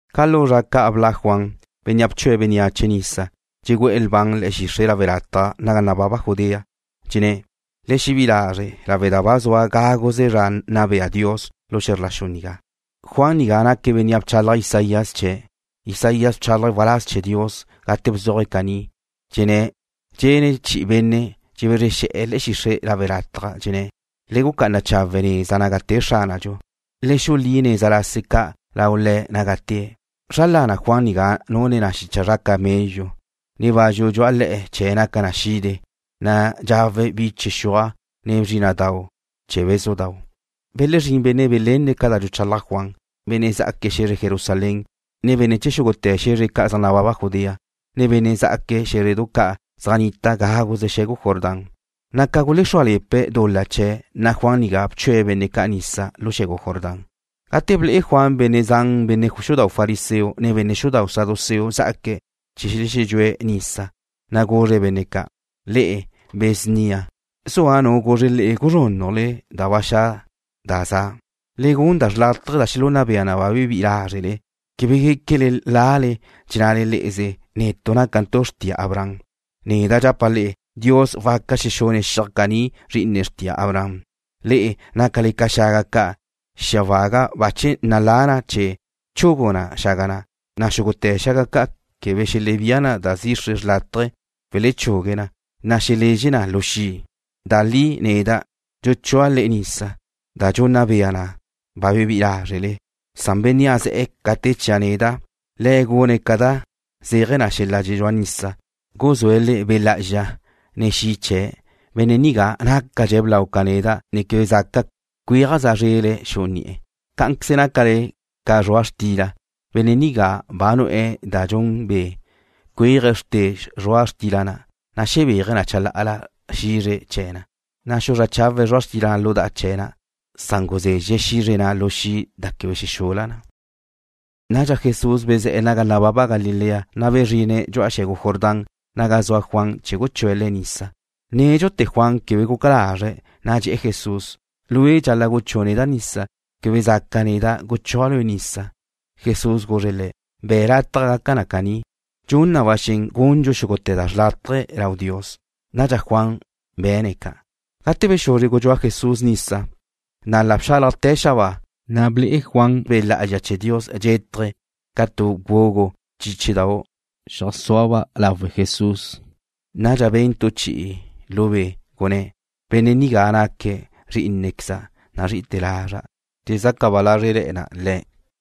Ca lu zra ca' bla' Juan, bénnea' bchue̱' bénneache nisa, dxegu'e̱ lban le̱'e̱ xixre' lawe' lataj naga nababa Judea. Dxenné̱': ―Le xebí'i lazre' lawe' da ba zua gáguze zra nna bea Dios lu xe̱zr la xu nigá. Juan nigá naque̱' bénnea' bchalaj Isaías chee̱'. Isaías bchálaje̱' waláz chee̱ Dios gate bzuaje̱' caní: Dxene chi'i benne' dxebezre xe̱'e̱ le̱'e̱ xixre' lawe' lataj, dxenné̱': Le gucá'ana chawe' neza naga te Xránadxu. Le xulí neza lase ca' lau Le̱' naga tée̱'. Zra lana Juan nigá nune na xicha zra camello, ne bazxu dxu'a le̱'e̱ chee̱' naca na xide, na' dxawe̱' biche xuaj, ne bzrína'dau' chee̱ bézudau'. Belezrín benne' belenne̱' ca da dxuchalaj Juan, benne' zá'aque̱' xe̱zre Jerusalén, ne benne' chee̱ xúgute̱ xe̱zre ca' zaj nababa Judea, ne benne' zá'aque̱' xé̱zredu ca' zaj nnita gáguze xe̱gu Jordán. Ca gulexrúale̱pe̱' dul-la chee̱', Juan nigá bchue̱' benne' ca' nisa lu xe̱gu Jordán. Gate ble'e Juan benne' zan benne' xudau' fariseo, ne benne' xudau' saduceo zá'aque̱' chee̱ xelexedxúe̱' nisa, na' guzre̱' benne' ca': ―Le'e, be̱ snia. ¿Zua nu guzre le'e guzrúnnajle da ba xa' da za'? Le gun da xrlátaje da xelunna bea na ba bebí'i lázrele. Quebe guéquele lale, dxennale le'eze: “Nalatu' lawe' da nácantu' xrtia Abraham.” Neda' dxapa' le'e: Dios waca xexune̱' xiaj caní zri'ine xrtia Abraham. Le'e nácale ca xaga ca'. Xia waga bache nalá na chee̱ chugu na xaga ca', na' xúgute̱ xaga ca' quebe dxelebía na da zixre chawe' welechugue na, na' xelezxe na lu xi'. Da li neda' dxuchúa' le'e nisa, da dxunna bea na ba bebí'i lázrele, san Bénnea' ze̱'e̱ ca te chia' neda', Le̱' gune̱' ca da zéaje̱ xel-la' dxedxúa nisa, guzúe̱' le'e Dios Be' Lá'azxa, ne xi' chee̱'. Benne' nigá nácadxe̱' blau ca neda', na' quebe zaca' cuéajza' zrele̱' xu'u ni'e̱. Cá'anqueze nácale ca zrua' xtila. Benne' nigá ba nu'e̱ da dxun be', cuéaje̱' xrte zrua' xtila na', na' xebéaje̱' chalá'ala xizre chee̱ na, na' xuzrá chawe̱' zrua' xtila na' lu da'a chee̱ na, san guzezxe̱' xizre na' lu xi' da quebe xexula na. Nadxa Jesús bezé̱'e̱ naga nababa Galilea, na' bezrine̱' dxu'a xe̱gu Jordán naga zua Juan chee̱ guchúe̱' Le̱' nisa. Nédxute̱ Juan quebe guca lazre̱', na' dxe̱'e̱ Jesús: ―Lue' dxal-la' guchú'u neda' nisa. Quebe zaca' neda' guchúa' Lue' nisa. Jesús guzre̱' le̱': ―Be̱' lataj gaca caní na'a. Dxun na ba xen gundxu xúgute̱ da xrlátaje lau Dios. Nadxa Juan be̱ne̱' ca'. Gate bexuzre gudxúa Jesús nisa, na' la bxálajte̱ xabáa, na' ble'e Juan Be' Lá'azxa chee̱ Dios dxétaje̱' ca tu gugu chíchidau', zeajsúaba' lawe Jesús. Nadxa ben tu chi'i lu be', gunné̱': ―Benne' nigá naque̱' Zrí'inequeza' nazrí'ite̱ lazra'. Dxezaca ba lázrele̱na' Le̱'.